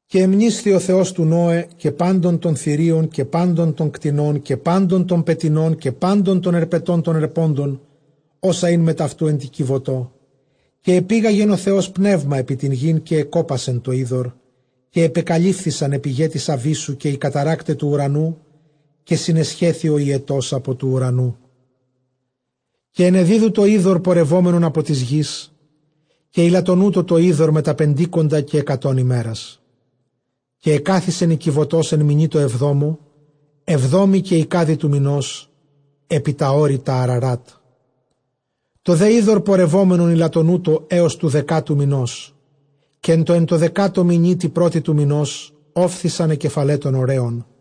Καὶ ἀνεμνήσθη ὁ Θεὸς τοῦ Νῶε, καὶ πάντων τῶν θηρίων, καὶ πάντων τῶν κτηνῶν, καὶ πάντων τῶν πετεινῶν, καὶ πάντων τῶν ἑρπετῶν τῶν ἑρπόντων, ὅσα ἦν μετʼ αὐτοῦ ἐν τῇ κιβωτῷ· καὶ ἐπήγαγεν ὁ Θεὸς πνεῦμα ἐπὶ τὴν γῆν, καὶ ἐκόπασε τὸ ὕδωρ. Καὶ ἐπεκαλύφθησαν αἱ πηγαὶ τῆς ἀβύσσου, καὶ οἱ καταῤῥάκται τοῦ οὐρανοῦ, καὶ συνεσχέθη ὁ ὑετὸς ἀπὸ τοῦ οὐρανοῦ. Καὶ ἐνεδίδου τὸ ὕδωρ πορευόμενον ἀπὸ τῆς γῆς· καὶ ἠλαττονοῦτο τὸ ὕδωρ μετὰ πεντήκοντα καὶ ἑκατὸν ἡμέρας. Καὶ ἐκάθισεν ἡ κιβωτὸς ἐν μηνὶ τῷ ἑβδόμῳ, ἑβδόμῃ καὶ εἰκάδι τοῦ μηνὸς, ἐπὶ τὰ ὄρη τὰ Ἀραράτ. Τὸ δὲ ὕδωρ ἠλαττονοῦτο ἕως τοῦ δεκάτου μηνός. Καὶ ἐν τῷ δεκάτῳ μηνὶ, τῇ πρώτῃ τοῦ μηνὸς, ὤφθησαν αἱ κεφαλαὶ τῶν ὀρέων.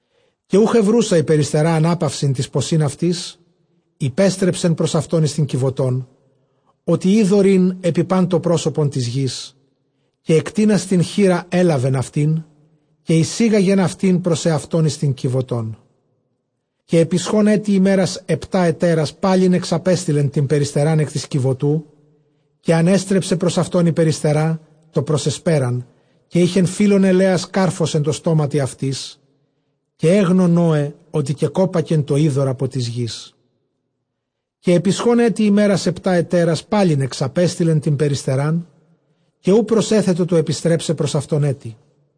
Καὶ οὐχ εὑροῦσα ἡ περιστερὰ ἀνάπαυσιν τοῖς ποσὶν αὐτῆς, ἀνέστρεψε πρὸς αὐτὸν εἰς τὴν κιβωτὸν, ὅτι ὕδωρ ἦν ἐπὶ πᾶν τὸ πρόσωπον τῆς γῆς· καὶ ἐκτείνας τὴν χεῖρα ἔλαβεν αὐτὴν, καὶ εἰσήγαγεν αὐτὴν πρὸς ἑαυτὸν εἰς τὴν κιβωτόν. Καὶ ἐπισχὼν ἔτι ἡμέρας ἑπτὰ ἑτέρας, πάλιν ἐξαπέστειλε τὴν περιστερὰν ἐκ τῆς κιβωτοῦ. Καὶ ἀνέστρεψε πρὸς αὐτὸν ἡ περιστερὰ τὸ πρὸς ἑσπέραν· καὶ εἶχε φύλλον ἐλαίας κάρφος ἐν τῷ στόματι αὐτῆς· καὶ ἔγνω Νῶε, ὅτι κεκόπακε τὸ ὕδωρ ἀπὸ τῆς γῆς. Καὶ ἐπισχὼν ἔτι ἡμέρας ἑπτὰ ἑτέρας, πάλιν ἐξαπέστειλε τὴν περιστερὰν, καὶ οὐ προσέθετο τοῦ ἐπιστρέψαι πρὸς αὐτὸν ἔτι.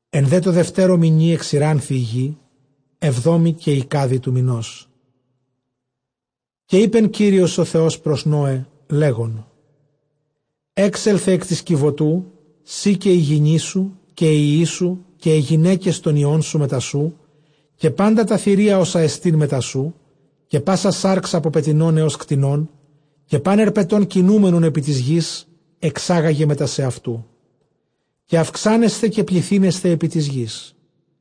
Ἐν δὲ τῷ δευτέρῳ μηνὶ ἐξηράνθη ἡ γῆ, ἑβδόμῃ καὶ εἰκάδι τοῦ μηνός. Καὶ εἶπε Κύριος ὁ Θεὸς πρὸς Νῶε, λέγων, Ἔξελθε ἐκ τῆς κιβωτοῦ σὺ, καὶ ἡ γυνή σου, καὶ οἱ υἱοί σου, καὶ αἱ γυναῖκες τῶν υἱῶν σου μετὰ σοῦ, Καὶ πάντα τὰ θηρία ὅσα ἐστὶ μετὰ σοῦ, καὶ πᾶσα σὰρξ ἀπὸ πετεινῶν ἕως κτηνῶν, καὶ πᾶν ἑρπετὸν κινούμενον ἐπὶ τῆς γῆς, ἐξάγαγε μετὰ σεαυτοῦ. καὶ αὐξάνεσθε καὶ πληθύνεσθε ἐπὶ τῆς γῆς.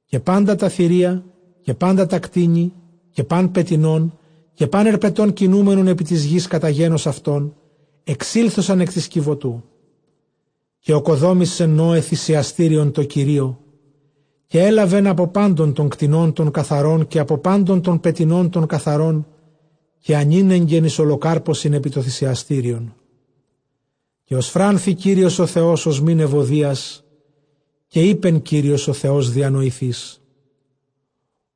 Καὶ πάντα τὰ θηρία, καὶ πάντα τὰ κτήνη, καὶ πᾶν πετεινὸν, καὶ πᾶν ἑρπετὸν κινούμενον ἐπὶ τῆς γῆς κατὰ γένος αὐτῶν, ἐξήλθοσαν ἐκ τῆς κιβωτοῦ. Καὶ ᾠκοδόμησε Νῶε θυσιαστήριον τῷ Κυρίῳ· καὶ ἔλαβεν ἀπὸ πάντων τῶν κτηνῶν τῶν καθαρῶν, καὶ ἀπὸ πάντων τῶν πετεινῶν τῶν καθαρῶν, καὶ ἀνήνεγκεν εἰς ὁλοκάρπωσιν ἐπὶ τὸ θυσιαστήριον. Καὶ ὠσφράνθη Κύριος ὁ Θεὸς ὀσμὴν εὐωδίας. Καὶ εἶπε Κύριος ὁ Θεὸς διανοηθείς,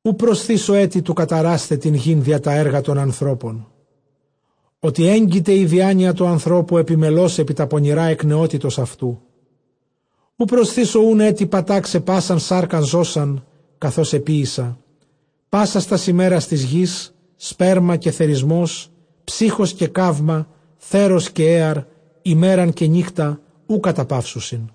οὐ προσθήσω ἔτι καταράσασθαι τὴν γῆν διὰ τὰ ἔργα τῶν ἀνθρώπων· ὅτι ἔγκειται ἡ διάνοια τοῦ ἀνθρώπου ἐπιμελῶς ἐπὶ τὰ πονηρὰ ἐκ νεότητος αὐτοῦ· οὐ προσθήσω οὖν ἔτι πατάξαι πᾶσαν σάρκα ζῶσαν, καθὼς ἐποίησα. Πάσας τὰς ἡμέρας τῆς γῆς, σπέρμα καὶ θερισμὸς, ψύχος καὶ καῦμα, θέρος καὶ ἔαρ, ἡμέραν καὶ νύκτα, οὐ καταπαύσουσι.